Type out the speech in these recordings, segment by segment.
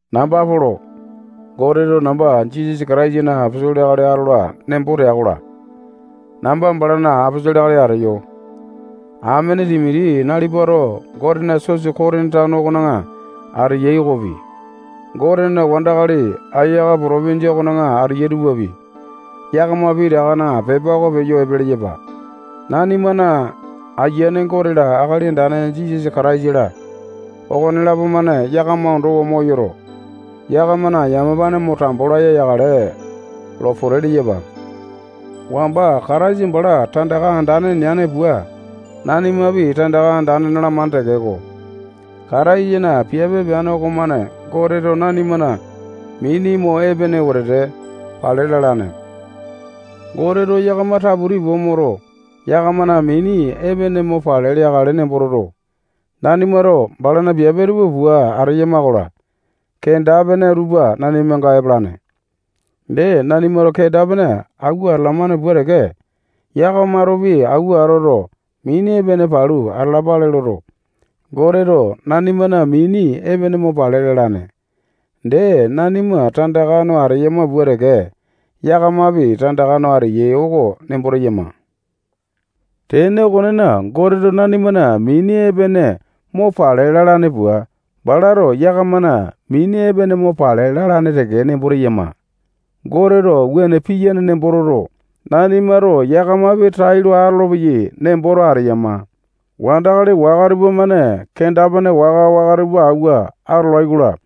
Namba Polo. Goteto namba Jisasa Kataisana aposolo akali atola nembo tea-kola, namba balana aposolo akali ateyo. Amene Timoti nalipato Gotena sosa Kotini tano okona ateya okopi, Gotena wandakali Akaya potopinjia okona ateyai tupapi, yakama pitakana pepa oko peyo epe leyapa. Nanimana Ayiane Gote-la, Akali Andane Jisasa Kataisa-la, okonelapo-mane yakama ondowa moyoto, yakamana yamapane mo tambo laya yakale lo pote leyapa. Wamba Kataisa bala tandaka andane neane pua, nanimapi tandaka andane nalamane tekeko, Kataisana piape peane okomane Goteto nanimana mini mo epene wetete pale lalane. Goteto yakama taputi pua moto, yakamana mini epene mo pale leakale nembo toto, nanimato balana piape tupa pua ateyama-kola, kenda-pene tupa nanimanga epalane. Dee, nanimato kenda-pene awua atalamane pua teke, yakamatopi awua atoto, mini epene palu atalapale loto, Goteto nanimana mini epene mo pale lalane. Dee, nanima tandaka no ateyama pua teke, yakamapi tandaka no ateyai oko nembo teyama. Tene okonena, Goteto nanimana mini epene mo pale lalane pua, balato yakamana mini epene mo pale lalane teke nembo teyama. Goteto wuane piyane nembo toto, nanimato yakamapi tailo atolopeyai nemboto ateyama. Wandakali waka tupamane kenda-pene waka-waka tupa awua atolai-kola,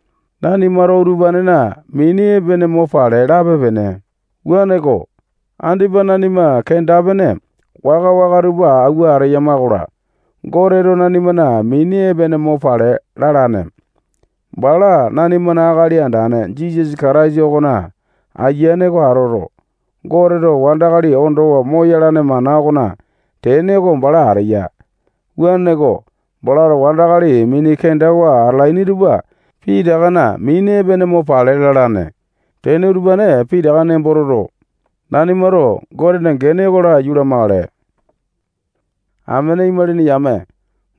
nanimato utupanena mini epene mo pale lape-pene. Wuaneko, andipa nanima kenda-pene waka-waka tupa awua ateyama-kola, Goteto nanimana mini epene mo pale lalane. Bala nanimana Akali Andane Jisasa Kataisa okona ayiane oko atoto, Goteto wandakali ondowa moyalane mana okona tene oko bala ateya. Wuaneko, balato wandakali mini kendawa atalaini tupa pitakana mini epene mo pale lalane. Tene utupane pitaka nembo toto, nanimato Gotena gene oko laiyu lamakale. Amene imalini yame,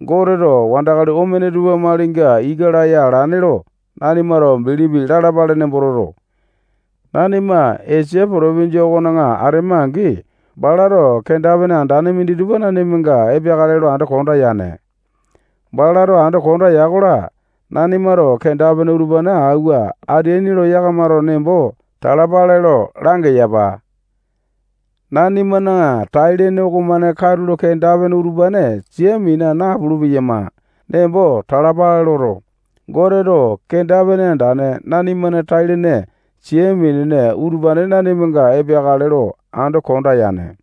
Goteto wandakali omene tupa malinga ika laya alane lo nanimato bilipi lalapale nembo toto, nanima Esia potopinjia okona atema-angi, balato kenda-pene andane minditupa nanimanga epeakale lo ando konda yane. Balato ando kondea-kola, nanimato kenda-pene utupane auwa ateaini lo yakamato nembo talapale lo langeyapa. Nanimana tai-lene okomane katulo kenda-pene utupane sia mina napulu-peyama nembo talapale loto, Goteto kenda-pene andane nanimana tai-lene sia minene utupane nanimanga epeakale lo ando konda yane.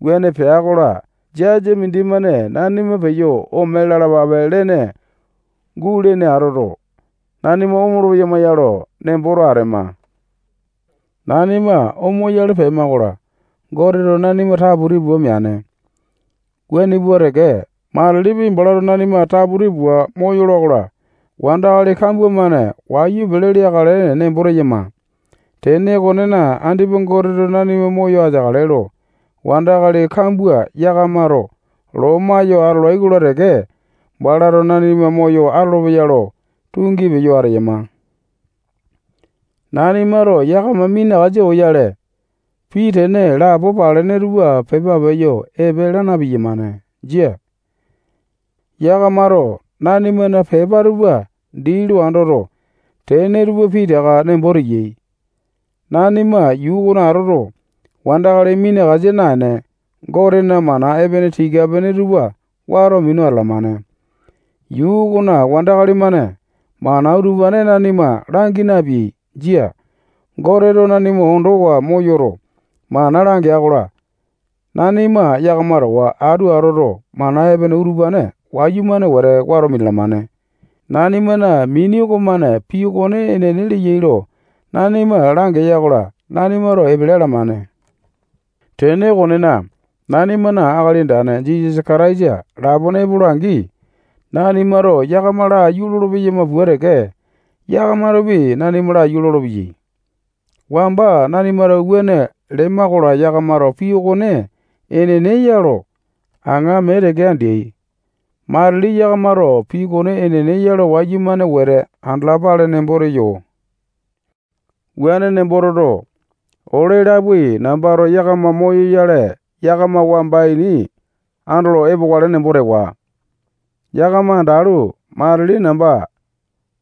Wuane pea-kola, jasa mindimane nanima peyo ome lalapape lene gulene atoto, nanima omolo-peyama ya lo nemboto atema. Nanima omoyale pema-kola, Goteto nanima taputi pua meane. Wuane pua teke, matilipi, balato nanima taputi pua moyola-kola, wandakali kambua-mane wayu pele leakale nembo teyama. Tene okonena, andipa Goteto nanima moyo ateakale lo, wandakali kambua yakamato loma yo atolai-kola teke, balato nanima moyo atolopeya lo tungi peyo ateyama. Nanimato yakama minakasa oyale, pii tene lapo palene tupa pepa peyo epe laa na-piyamane. Jia. Yakamato nanimana pepa tupa dii lo andoto, tene tupa pitaka nembo teyai. Nanima yuu okona atoto, wandakali minakasa naene, Gotena mana epene tika-pene tupa wato minu atalamane. Yuu okona wandakali-mane mana utupane nanima langi napeai. Jia. Goteto nanima ondowa moyoto, mana langea-kola, nanima yakama towa atu atoto, mana epene utupane wayumane wete wato minalamane. Nanimana mini okomane pii okone enene leyai lo nanima langeya-kola, nanimato epele alamane. Tene okonena, nanimana Akali Andane Jisasa lapone epola-angi, nanimato yakama laiyu lolo-peyama pua teke, yakamatopi nanima laiyu lolopeyai. Wamba nanimato wuane lema-kola, yakamato pii okone enene ya lo aŋa mee teke andeai. Matili yakamato pii okone enene ya lo wayumane wete andalapale nemboto teyo. Wuane nembo toto, ole lapoai nambato yakama moyoyale, yakama wamba ini andolo epokale nembo tewa. Yakama andalu, matili namba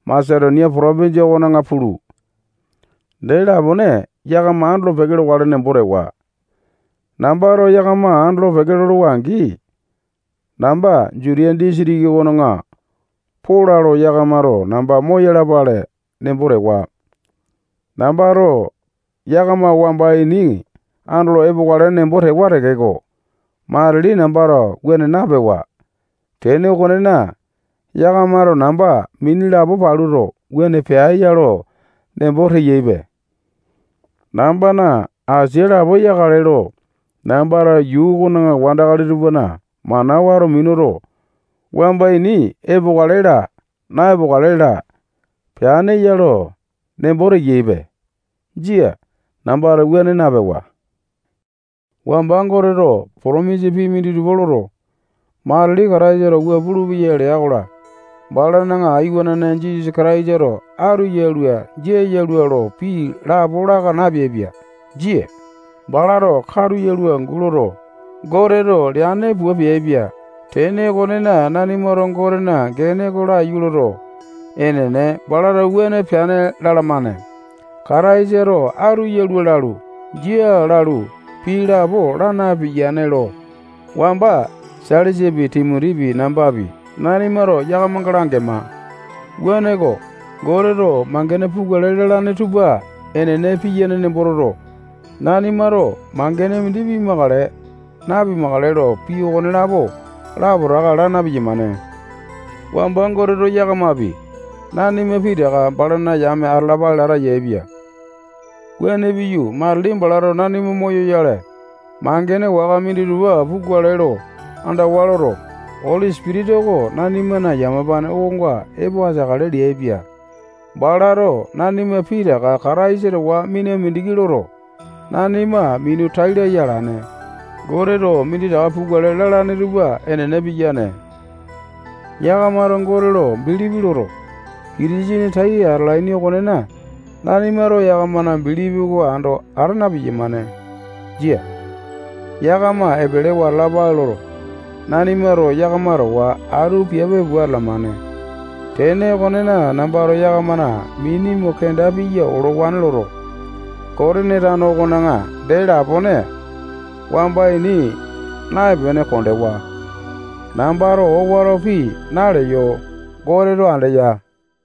Masetonia potopinjia okona pulu, dee lapone yakama andolo-peke lokale nembo tewa. Nambato yakama andolo-peke lolowa-angi, namba Jutiya disitiki okona pola lo yakamato namba moyalapale nembo tewa. Nambato yakama wamba ini andolo epokale nembo tewa tekeko, matili nambato wuane napewa. Tene okonena, yakamato namba mini lapo paluto, wuane pea ya lo nembo teyaipe. Nambana asia lapo yakale lo, nambato yuu okona wandakali tupana mana wato minuto, wamba ini epokale laa, na-epokale laa, peane ya lo nembo teyaipe. Jia. Nambato wuane napewa. Wamba Goteto potomisa pii minditupa loto, matili Kataisato wua pulupeya lea-kola, balana iwanane Jisasa Kataisato atu yalua, jia yalua lo pii lapo laka napeaipia. Jia. Balato katu yalua angu loto, Goteto leane pua peaipia. Tene okonena, nanimato Gotena gene oko laiyu loto, enene, balato wuane peane lalamane. Kataisato atu yalua lalu, jia lalu, pii lapo laa napiyane lo wamba Sailasapi, Timotipi, nambapi, nanimato yakamanga langema. Wuaneko, Goteto mangene pukale lalane tupa enene piyane nembo toto, nanimato mangene mindi pimakale, napimakale lo, pii okonelapo lapotaka laa na-piyamane. Wamba Goteto yakamapi, nanima pitaka balana yame atalapale lata yaepia. Wuane piyu, matili balato nanima moyoyale, mangene waka minditupa pukale lo andawa loto, Oli Sipitisa oko nanimana yamapane okonga epo ateakale leaipia. Balato nanima pitaka Kataisa towa mina mindiki loto, nanima minu tai laya alane. Goteto minditaka pukale lalane tupa enene piyane. Yakamato Gote lo bilipi loto, Kitisene tai atalaini okonena, nanimato yakamana bilipi oko ando ata na-piyamane. Jia. Yakama epelewa atalapale loto, nanimato yakama towa atu piape pua atalamane. Tene okonena, nambato yakamana mini mo kenda piya olowane loto, Kotini tano okona dee lapone wamba ini naepene kondewa. Nambato owato pii naleyo. Goteto andeya.